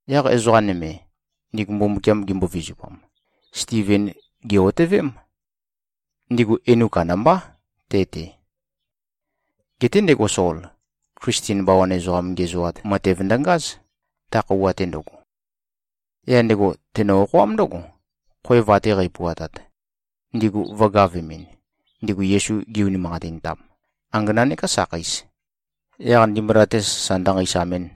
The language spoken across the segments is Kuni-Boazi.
Yaq ezoqa nøme, ndigu Mbumbukiam gimbo-vizupam, Stiven gè-otøvém. Ndigu enu kandambá te-te. Geté ndego Sol, Klisten bawan ezoqam ngiæzoat matev ndøngáz, ta khøuwa-te ndøgo. Yaq ndego tenø-okhoám ndǿgo, khoev ate qæpuatat, ndigu vø̄gavemɨn, ndigu Yesu gi-unimanqatintam, angana nekā sakheis, yaq ndimbula-te sasa ndønqeisamɨn.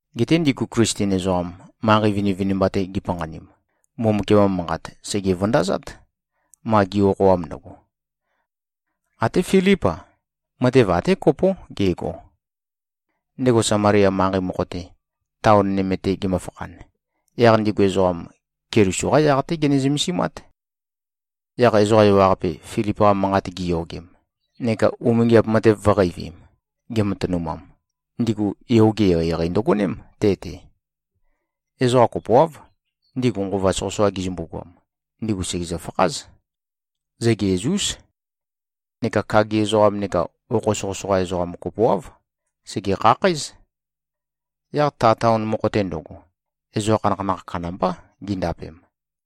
Geté ndigu Klisten ezoqam, manqei vinivinimba-te gipanqanim, Mbumbukiam-qa Manqat sège-vøndazát, ma gi꞉-okhoam ndøgo. Até Filíp-a, matev até kopó gego. Ndego Samalia manqei mokho-te, taon nøme-te gemøfakhan, yaq ndigu ezoqam, Keliso-qá yaq-té gene-zømesimát. Yaq ezoqa ewaqape, Filip-qa manqat giyogem neka umingiap matev vø̄qeivim, gematønumam, ndigu yoge eqeieqei ndøgoném te-te. Ezoqa kopoáv, ndigu nqova soqøsoqa gizømbu-goam, ndigu sègezø-fakház. Zøgeæz-ús. Neka kagi ezoqam neka okho soqøsoqa ezoqam kopoáv, sège-khakhǽz. Yaq ta taon mokho-te ndøgo, ezoqa khanakhanakh kandambá gindapem.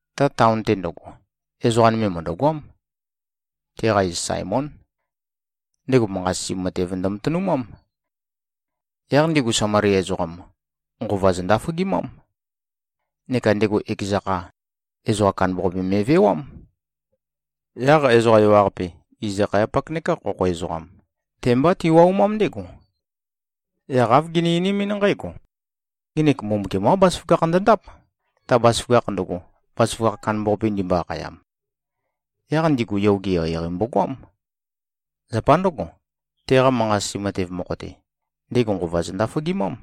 Ta taon-te ndøgo, ezoqa nøme mø̀ndøgoám. Teqa iz Saemón. Ndego manqa-sisi matev ndømatønumám. Yaq ndigu Samalia ezoqam, nqova zøndaføgimám. Neka ndego ekeza kha, ezoqa kandambaqape me꞉vewám. Yaq ezoqa ewaqape, iz-akhayapak nekā khokho ezoqam, te-mbá tiwaumám ndégo. Yaq āv gini-einimín nqǽgo, “Ngenek Mbumbukiam-qá bazaføgakh ndøndáp, ta bazaføgakh ndøgo, bazaføgakh kandambaqape ndimbo-akhayam.” Yaq ndigu yoge eqeieqei mbogoám. Zapa ndǿgo, teqa manqa-sisi matev mokho-te, ndego nqova zøndaføgimám.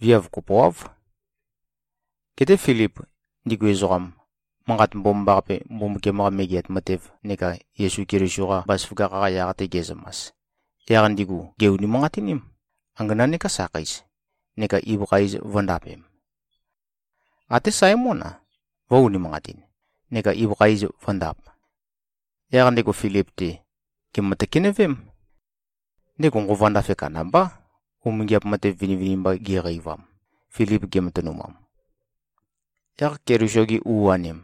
Viav kopoáv. Geté Filip, ndigu ezoqam, Manqat Mbomambaqape, Mbumbukiam-qa Megeat Matev neka Yesu Keliso-qa bazaføgakh-qa yaq-te ge꞉zømas, yaq ndigu gè-unimanqatiním, angana nekā sakheis, neka ibøkha iz vø̄ndapem. Até Saemón-a, vø̄-unimanqatin neka ibøkha iz vø̄ndap. Yaq ndego Filip-te, gèmø-tøkenøvém. Ndego nqova ndafe kandambá, umingiap matev vinivinimba geqeivam, Filip gematønumam. Yaq Keliso-gi u-anim,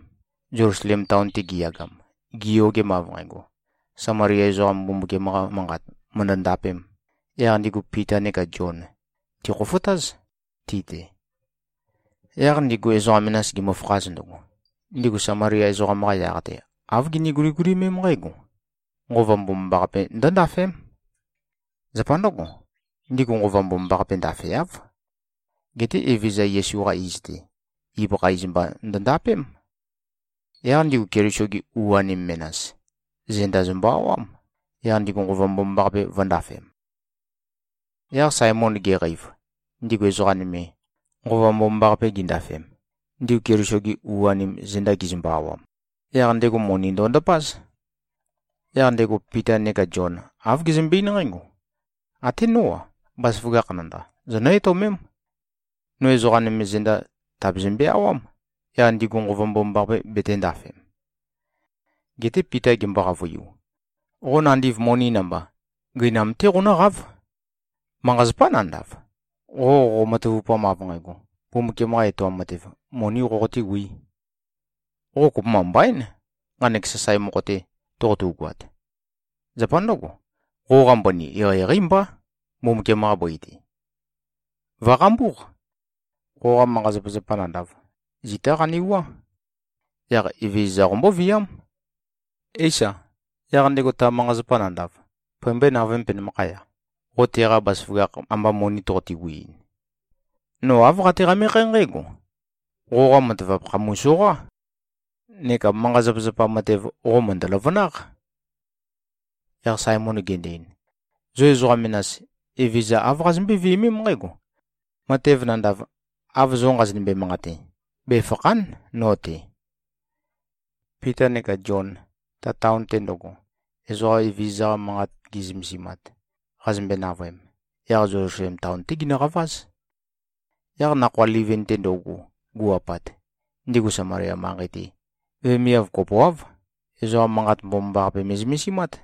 Zelusalem taon-te giyagam, giyogem av nqægo, Samalia ezoqam Mbumbukiam-qa Manqat mø̀ndø-ndapēm, yaq ndigu Pita neka Zion tìkhofotáz, ti-te. Yaq ndigu ezoqa menas gimøfakhaz ndøgo, ndigu Samalia ezoqam-qa yaq-te, āv gini-guligulimém nqǽgo, Nqova Mbomambaqape ndø̄ndafēm. Zapa ndǿgo, ndigu Nqova Mbomambaqape ndafeáv. Geté Evezøza Yesu-qa iz-te, ibøkha iz mba ndøndapém. Yaq ndigu Keliso-gi u-anim menas, zenda zømbø-awám, yaq ndigu Nqova Mbomambaqape vø̄ndafem. Yaq Saemon geqeiv, ndigu ezoqa nøme, Nqova Mbomambaqape gindafem, ndigu Keliso-gi u-anim zenda gizømbø-awam, yaq ndego moni ndondapáz. Yaq ndego Pita neka Zion, āv gezømbe-eín nqǽgo, “Até nó-a. Bazaføgakh nandav, zonǿ-etøomém. No ezoqa nøme zenda, tàbazømbe-awám, yaq ndigu Nqova Mbomambaqape betēndafem.” Geté Pita gembo-qavøiu, “Qo nandiv moni namba, gøinam-té qonǿqáv! Manqa-zapá nandav, qo qoqo-matavupam av nqægo, Mbumbukiam-qa etoam matev, monī qoqotēwī. Qo kopømba mbaín, nqanek sasae mokho-te toqotugoat. Zapa ndǿgo, qoqa mbøni, eqeieqeí mbá, Mbumbukiam-qa bøi-te. Vø̀qambúq. Qoqa manqa-zapazapa nandav, zitá qanewuá. Yaq Evezøza qombóviám. Éisa, yaq ndego ta manqa-zapa nandav pømbøé-navøēm, penømakhaya, qo teqa bazaføgakh amba moni toqote-wiin. No āv qate-qamekhé nqǽgo: Qoqa matavap khàpumu-soqá. Neka manqa-zapazapa matev, qo mø̀ndø-løvønáq.” Yaq Saemon gendo-ein, “Zo ezoqa menas, Evezøza āv qazømbøé-viømém nqǽgo: Matev nandav, av zo nqazonømbe-manqate, befàkha᷄n no-te.” Pita neka Zion, ta taon-te ndøgo, ezoqa Evezøza-qa manqat gi꞉zømesimat, qazømbe-navøem, yaq Zelusalem taon-té ginøqaváz. Yaq nakhoa livin-te ndøugu gu꞉-apat, ndigu Samalia manqei-te, vemiav kopoáv, ezoqa Manqat Mbomambaqape me꞉zømesimát.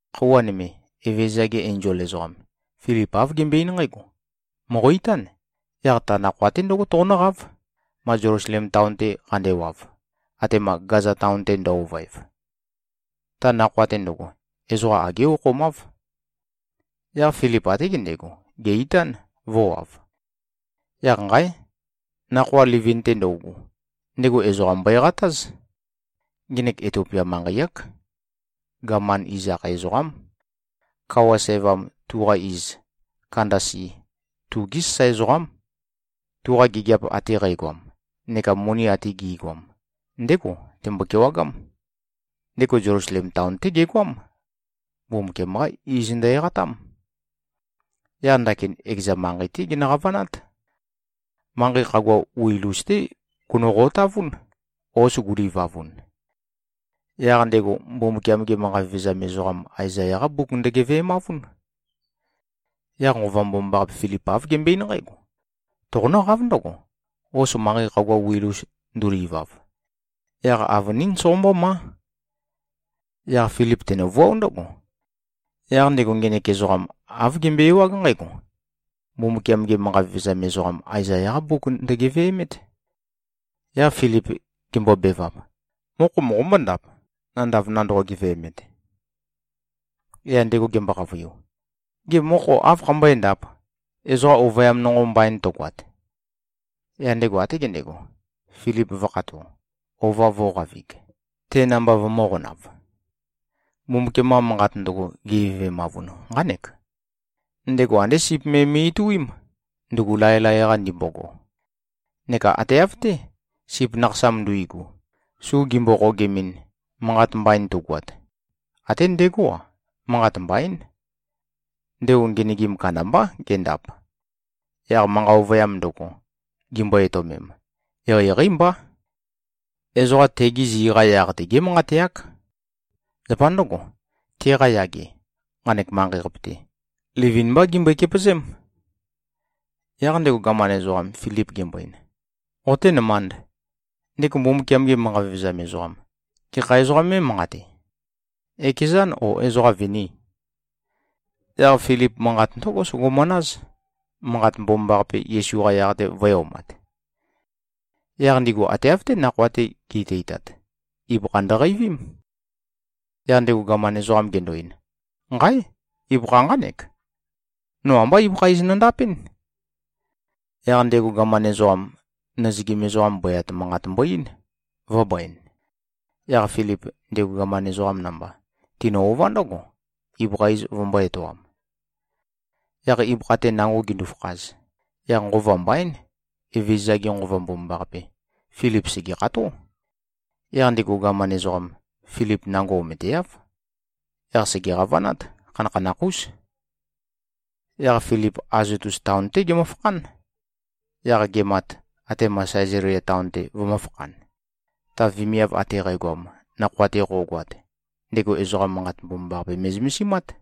Khøuwa nøme, Evezøza-ge enzol ezoqam, Filip āv gembøe-eín nqǽgo, “Mòqo-itán, yaq ta nakhoa-te ndǿgo toqonǿqáv, ma Zelusalem taon-te qandewav, atema Gaza taon-te ndø-ovøev.” (Ta nakhoa-te ndøgo, ezoqa agé okhomáv.) Yaq Filip até gendego, gè-itán, vø̄wav. Yaq nqáe! Nakhoa livin-te ndøugu, ndego ezoqa mbøeqatáz. Ngenek Itiopia manqei-ák. Gaman iz akhae ezoqám. Kawa sævam, tuqa iz Kandasi, tugé sasae ezoqám. Tuqa gigiap ate qægoam neka moni ate gi꞉goam, ndégo tembo-kewagám. Ndego Zelusalem taon-té gegoám. Mbumbukiam-qá iz ndø-eqatám. Yaq ndakin ekeza manqei-té genø-qavanát. Manqei khagua wil-us-té gono-qotavún, hos gulivavun. Yaq ndego, Mbumbukiam-ge manqa vevezam ezoqam Aezaya-qá mbuk ndøgeve꞉mavún. Yaq Nqova Mbomambaqape, Filip āv gembøe-eín nqǽgo, “Toqonǿqáv ndǿgo, hos manqei khagua wil-us ndulivav. Yaq avønín soqombómá.” Yaq Filip tenøvuáo ndǿgo. Yaq ndego ngenek ezoqam āv gembøe-ewág nqǽgo: Mbumbukiam-ge manqa vevezam ezoqam Aezaya-qá mbuk ndøgeve꞉mét. Yaq Filip gembobevap, “Mokho moqombó-ndap, nandav nandoqo-geve꞉met?” Yaq ndego gembo-qavøiu, “Gê, mokho áv khambøéndāp, ezoqam ovøyam nonqo mbain tøgoat?” Yaq ndego até gendego, Filip vø̄khato, ova vō꞉qavig, te namba vømø̄qonav. Mbumbukiam-qa Manqat ndøgo, gegeve꞉mavun, nqánek, “Ndego andé sip me me꞉-ituím, ndugu laelae-qa ndimbogo. Neka ate av-té, sip nakhasam nduigu, su gimbo-qogemɨn, manqat mbain tugoat, até ndegó-a, manqat mbaín. Ndego ngenøgim kandambá gendap. Yaq manqa ovøyam ndøgo, gimbo-etøomem, eqeieqeí mbá. Ezoqa tegi zi-qa yaq-te gémanqateák. Zapa ndǿgo, teqa yage, nqanek manqei-qape-te, livin-mbá gembøe-kepøzém.” Yaq ndego gaman ezoqam, Filip gembo-ein, “Qoténømānd. Ndego Mbumbukiam-ge manqa vevezam ezoqam, gekha ezoqā mé꞉manqate? Ekezân, ó, ezoqâ vinì?” Yaq Filip manqat ndǿgo sogomanáz, Manqat Mbomambaqape, Yesu-qa yaq-te, vø̄e-omat. Yaq ndigu ate av-té nakhoa-te gi꞉teitat, ibøkha ndøqeivím. Yaq ndego gaman ezoqam gendo-ein, “Nqáe! Ibøkha nqánek. No ambá ibøkha iz nondapɨ́n.” Yaq ndego gaman ezoqam, nøzøgim ezoqam bøyat manqat mbo-eín, vø̄bøen. Yaq Filip, ndego gaman ezoqam namba, tinø-ová ndǿgo, ibøkha iz vømbō-etoam. Yaq ibøkha-te nango gindu-fakhaz, yaq nqova mbaín, Evezøza-ge Nqova Mbomambaqape, Filip sègekható. Yaq ndego gaman ezoqam, Filip nango ometeáv. Yaq sège-qavanát. Khanakhanakh-ús. Yaq Filip Azotus taon-té gemøfakhán. Yaq gemat, atema Sæzalia taon-te vømø̄fakhan, ta vemiav ate qægoam, nakhoa-te qo꞉goat, ndego ezoqa Manqat Mbomambaqape me꞉zømesimát.